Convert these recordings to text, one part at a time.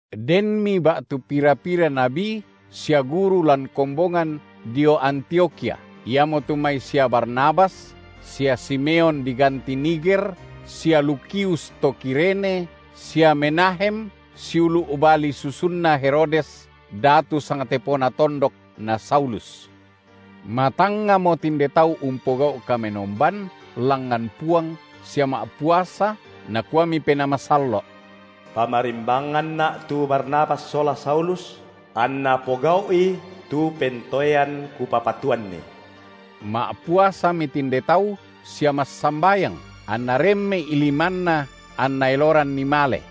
Denmi ba’tu pira-pira nabi sia guru lan kombongan dio Antiokhia, iamotu mai sia Barnabas sia Simeon diganti Niger, sia Lukius to Kirene sia Menahem, siulu’ bali susunna Herodes, datu sangtepona tondok, na Saulus. Matangngamo tinde tau umpogau’ kamenomban langngan Puang sia ma’puasa, Nakuami Penaa Masallo’: PamarimbanganNa’ tu Barnabas sola Saulus, anna pogau’i tu pentoean Kupapatuanni. Ma’puasami tinde tau sia massambayang, anna remme’i limanna, anna eloranni male.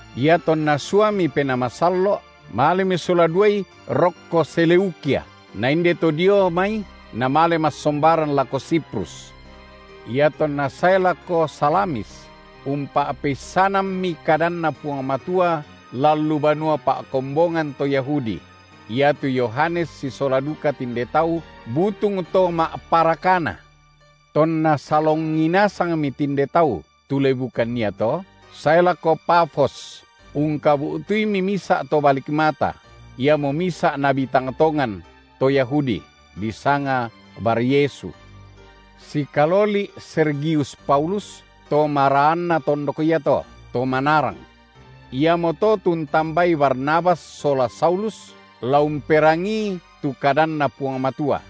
Iatonna suami Penaa Masallo’ malemi sola duai rokko Seleukia, na inde to dio mai namale massombaran lako Siprus. Iatonna sae lako Salamis umpa’peissanammi kadanNa Puang Matua lan lu banua pa’kombonganna to Yahudi; iatu Yohanes sisola duka tinde tau butung to ma’parakana. Tonna salongi nasangmi tinde tau tu lebukan iato sae lako Pafos, ungkabu’tuimi misa’ to balik mata, iamo misa’ nabi tang tongan, to Yahudi, disanga Baryesu, sikaloli’ Sergius Paulus, to maraanna tondok iato, to manarang. Iamoto tu untambai Barnabas sola Saulus, la umperangii tu kadanNa Puang Matua.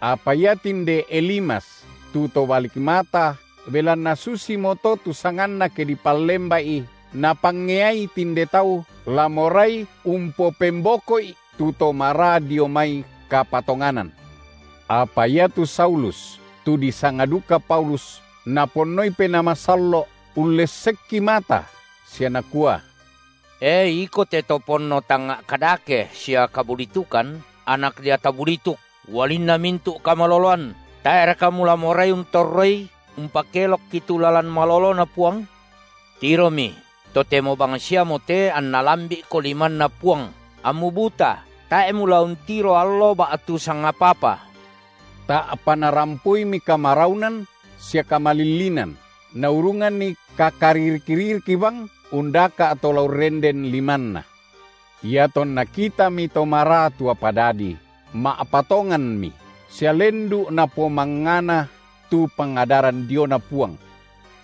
Apa ia tinde Elimas, tu to balik mata, belanna susimoto tu sanganna ke dipallemba’i, napangeai tinde tau la morai umpopemboko’i tu to maraa dio mai kapatonganan. Apa iatu Saulus, tu disanga duka Paulus, Naponnoi Penaa Masallo’ ullessekki mata, sia nakua: E iko te to ponno tangnga’ kadake sia kabulitukan, anak deata bulituk, ualinna mintu’ kamaloloan! tae’raka mula morai untorroi umpakelokki tu lalan maloloNa Puang? Tiromi, totemo bangsiamote anna lambi’ko limanNa Puang, ammu buta, tae’ mula untiro allo ba’tu sangapa-apa. Ta’pa narampoimi kamaraunan sia kamalillinan, naurunganni kakaririk-ririk bang undaka’ to la urrenden limanna. Iatonna kitami to maraa tu apa dadi, ma’patonganmi, sia lendu’ napomangngana tu pangadaran diona Puang.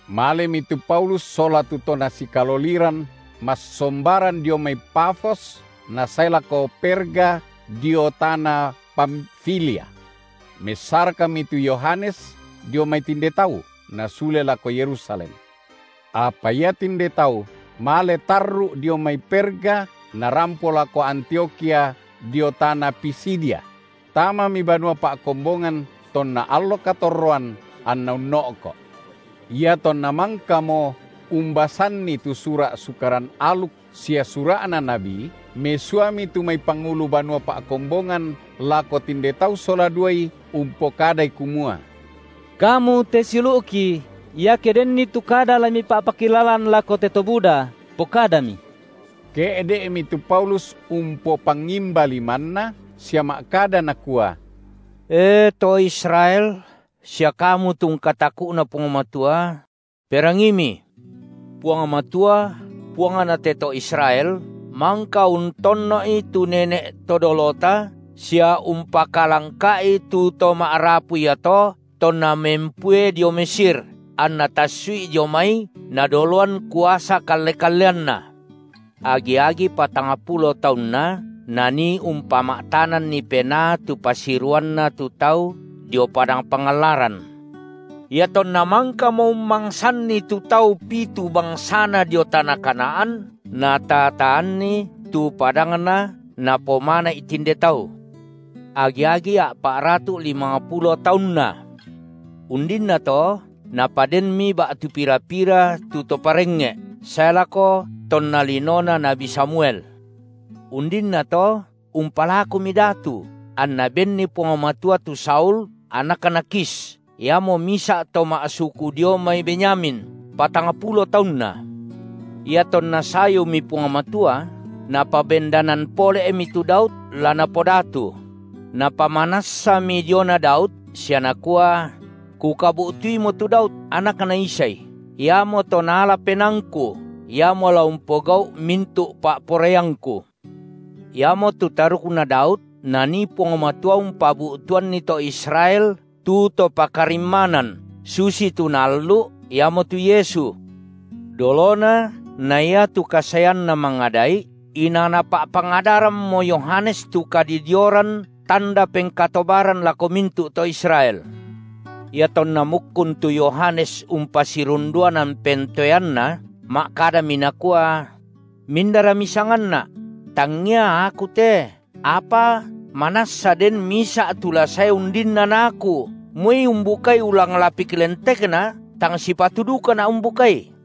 Malemi tu Paulus sola tu to nasikaloliran massombaran dio mai Pafos nasae lako Perga dio tana Pamfilia. Messarakmi tu Yohanes dio mai tinde tau, nasule lako Yerusalem. Apa ia tinde tau male tarru’ dio mai Perga narampo lako Antiokhia dio tana Pisidia; tamami banua pa’kombongan tonna allo katorroan, anna unno’ko’. Iatonna mangkamo umbasanni tu sura’ Sukaran aluk sia sura’na nabi, mesuami tu mai pangulu banua pa’kombongan lako tinde tau sola duai umpokadai kumua: kamu te siulu’ki, iake denni tu kada la mipa’pakilalan lako te to buda, pokadami. Ke’de’mi tu Paulus umpopangimba limanna sia ma’kada nakua: E, to Israel sia kamu tu ungkataku’na Puang Matua! perangiimi! Puang Matua, Puangna te to Israel, mangka untonno’i tu nene’ to dolota, sia umpakalangka’i tu to ma’rapu iato tonna mempue dio Mesir, anNa tassu’i dio mai Nadoloan kuasa kalle-kalleanNa. Agi-agi patangpulo taunna Nanii umpama’tananni penaa tu pasiruanna tu tau dio padang pangallaran. Iatonna mangkamo ummangsanni tu tau pitu bangsana dio tana Kanaan, nataa-taanni tu padangna napomana’i tinde tau, agi-agi a’pa’ratu’ llimangpulo taunna. Undinnato napadenmi ba’tu pira-pira tu to parengnge’ sae lako tonna linona nabi Samuel. Undinnato umpalakumi datu, anna benni Puang Matua tu Saul anakna Kish, iamo misa’ to ma’suku dio mai Benyamin, patangpulo taunna. Iatonna sayumi Puang Matua, Napabendanan pole’mi tu Daud la napodatu; Napamanassami diona Daud, sia Nakua: Kukabu’tuimo tu Daud, anakna Isai, iamoto naala penaangKu, iamo la umpogau’ mintu’ pa’poraiangKu. Iamotu tarukna Daud, Nanii Puang Matua umpabu’tuanni to Israel tu To pakarimmanan, susitu Naallu’, Iamotu Yesu. Dolona na iatu kasaeanNa mangada’i, inang napa’pangadarammo Yohanes tu kadidioran tanda pengkatobaran lako mintu’ to Israel. Iatonna mukkun tu Yohanes umpasirundunan pentoeanna, ma’kadami nakua: Mindara misanganna’? Tangia aku te, apa manassa den Misa’ tu la sae undinna na aku, moi umbukai ulang lapik lentekNa tang sipatu dukana’ umbukai.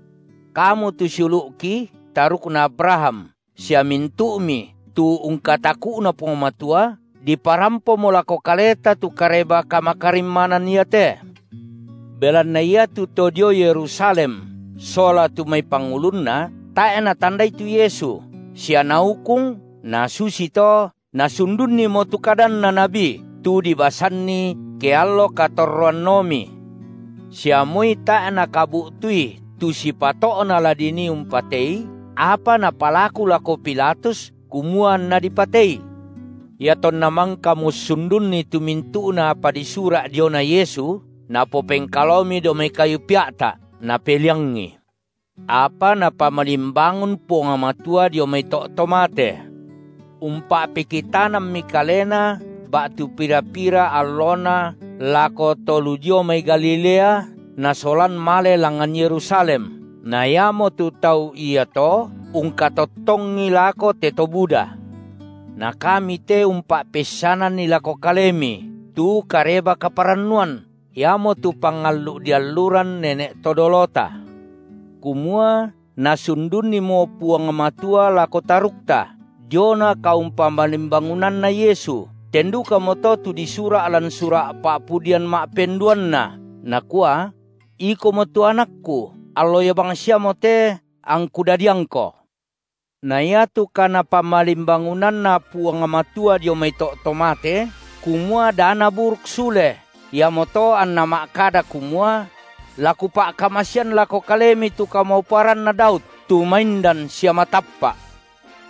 Kamu tu siulu’ki, tarukna Abraham sia mintu’mi tu ungkataku’Na Puang Matua, diparampomo lako kaleta tu kareba-kamakarimmanan iate. Belanna iatu to dio Yerusalem sola tu mai pangulunna, tae’ natandai tu Yesu, sia naukung na susito nasundunnimo tu kadanna nabi tu dibasanni ke allo katorroanomi. Sia moi tae’ nakabu’tui tu sipato’na la dinii umpatei, apa napalaku lako Pilatus kumua anNa dipatei. Iatonna mangkamo ussundunni tu mintu’na apa disura’ diona Yesu, napopengkalaomi dao mai kayu pea’ta’, napeliangI. Apa Napamalimbangun Puang Matua dio mai to’ to mate. Umpa’pekitanammi Kalena ba’tu pira-pira allona lako to lu dio mai Galilea nasolan male langngan Yerusalem na (totemo) iamotu tau iato ungkatottongi lako te to buda. Na kami te umpa’peissananni lako kalemi tu Kareba-kaparannuan, iamotu pangallu’ dialluran nene’ to dolota, kumua Nasundunnimo Puang Matua lako tarukta diona kaumpamalimbangunanna Yesu, ten dukamoto tu disura’ lan sura’ Pa’pudian ma’penduanna nakua: Ikomo tu AnakKu, allo ia bangsiamote angKu dadiangKo. Na iatu kaNapamalimbangunanna Puang Matua dio mai to’ to mate, kumua da Naburuk sule, iamoto anNa ma’kada kumua: La Kupa’kamasean lako kalemi tu kamauparanna Daud, tu maindan sia matappa’.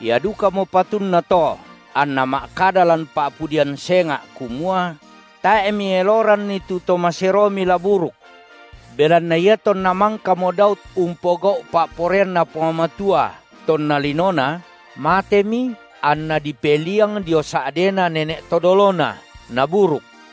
Ia dukamo patunna to anNa ma’kada lan Pa’pudian senga’ kumua: Tae’ Mieloranni tu To maseroMi la buruk. Belanna iatonna mangkamo Daud umpogau’ pa’poraianNa Puang Matua tonna linona, matemi anna dipeliang dio sa’dena nene’ to dolona, naburuk.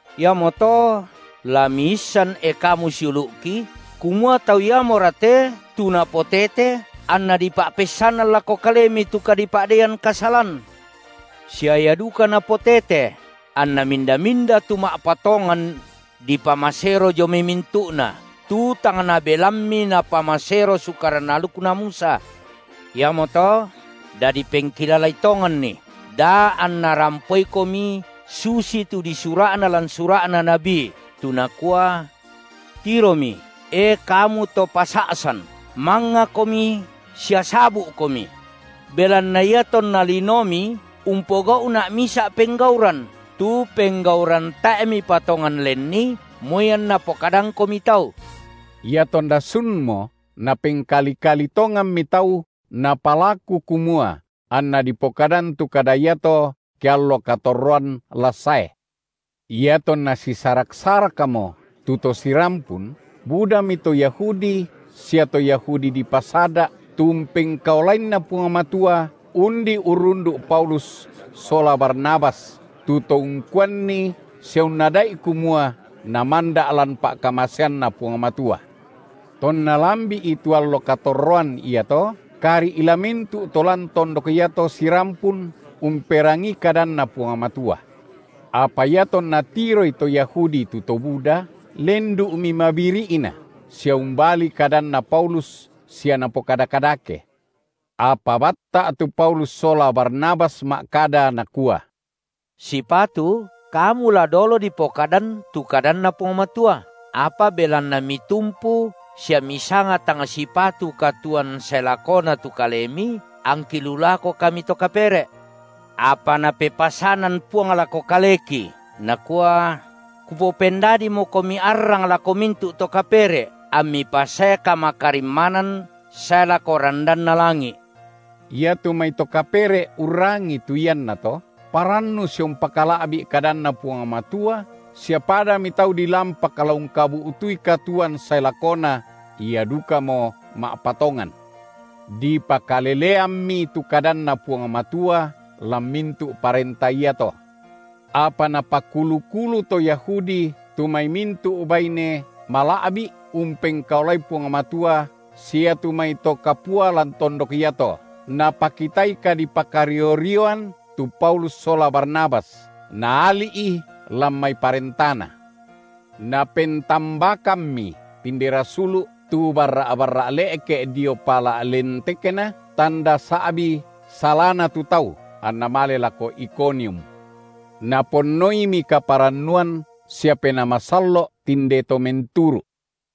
Iamoto la miisan e kamu siulu’ki, kumua Tau iamora te tu napotete anna dipa’peissanan lako kalemi tu kadipa’deian kasalan, sia Ia duka napotete, anna minda-minda tu ma’patongan dipamasero dio mai mintu’na, tu tang nabelammi napamasero sukaran alukna Musa. Iamoto dadi pengkilalai tonganni, da anna rampoikomi susi tu disura’na lan sura’na nabi, tu nakua: Tiromi, e kamu to pasa’san, mangngakomi sia sabu’komi; belanna iatonna linomi umpogau’Na’ misa’ penggauran, tu penggauran tae’ mipatongan lenni moi anna pokadangkomi tau. Iatonna sunmo napengkali-kali tonganmi tau napalaku kumua anna dipokadan tu kada iato ke allo katorroan la sae. Iatonna sisarak-sarakmo tu to sirampun, budami to Yahudi sia to Yahudi dipasada’ tu umpengkaolainNa Puang Matua, undi urrundu’ Paulus sola Barnabas, tu to ungkuanni sia unnada’i kumua namanda’ lan pa’kamaseanNa Puang Matua. Tonna lambi’i tu allo katorroan iato, kari’ la mintu’ to lan tondok iato sirampun umperangii kadanNa Puang Matua. Apa iatonna tiroi to Yahudi tu to buda, lendu’mi mabiri’na, sia umbali kadanna Paulus sia napokada kadake. Apa batta’ tu Paulus sola Barnabas ma’kada nakua: Sipatu kamu la dolo dipokadan tu kadanNa Puang Matua, apa belanna mitumpu sia misanga tang sipatu katuoan sae lakona tu kalemi, angki lu lako kami to kapere’. Apa Napepasanan Puang lako kaleki, Nakua: Kupopendadimokomi arrang lako mintu’ to kapere’, ammi pasae kamakarimmanan sae lako randanna langi’. Iatu mai to kapere’ urrangii tu iannato, parannu sia umpakala’bi’ kadanNa Puang Matua sia padami tau dilampak la ungkabu’tui katuoan sae lakona, ia dukamo ma’patongan. Dipakaleleammi tu kadanNa Puang Matua lan mintu’ parenta iato. Apa napakulu-kulu to Yahudi tu mai mintu’ baine mala’bi’ umpengkaolai Puang Matua sia iatu mai to kapua lan tondok iato, napakitai kadipakario-rioan tu Paulus sola Barnabas, naali’i lan mai parentana. Napentambakammi tinde rasulu’ tu barra’-barra’ le’ke dio pala’ lentekna, tanda sa’bi salana tu tau, anna male lako Ikonium. Naponnoimi kaparannuan sia Penaa Masallo’ tinde to menturu’.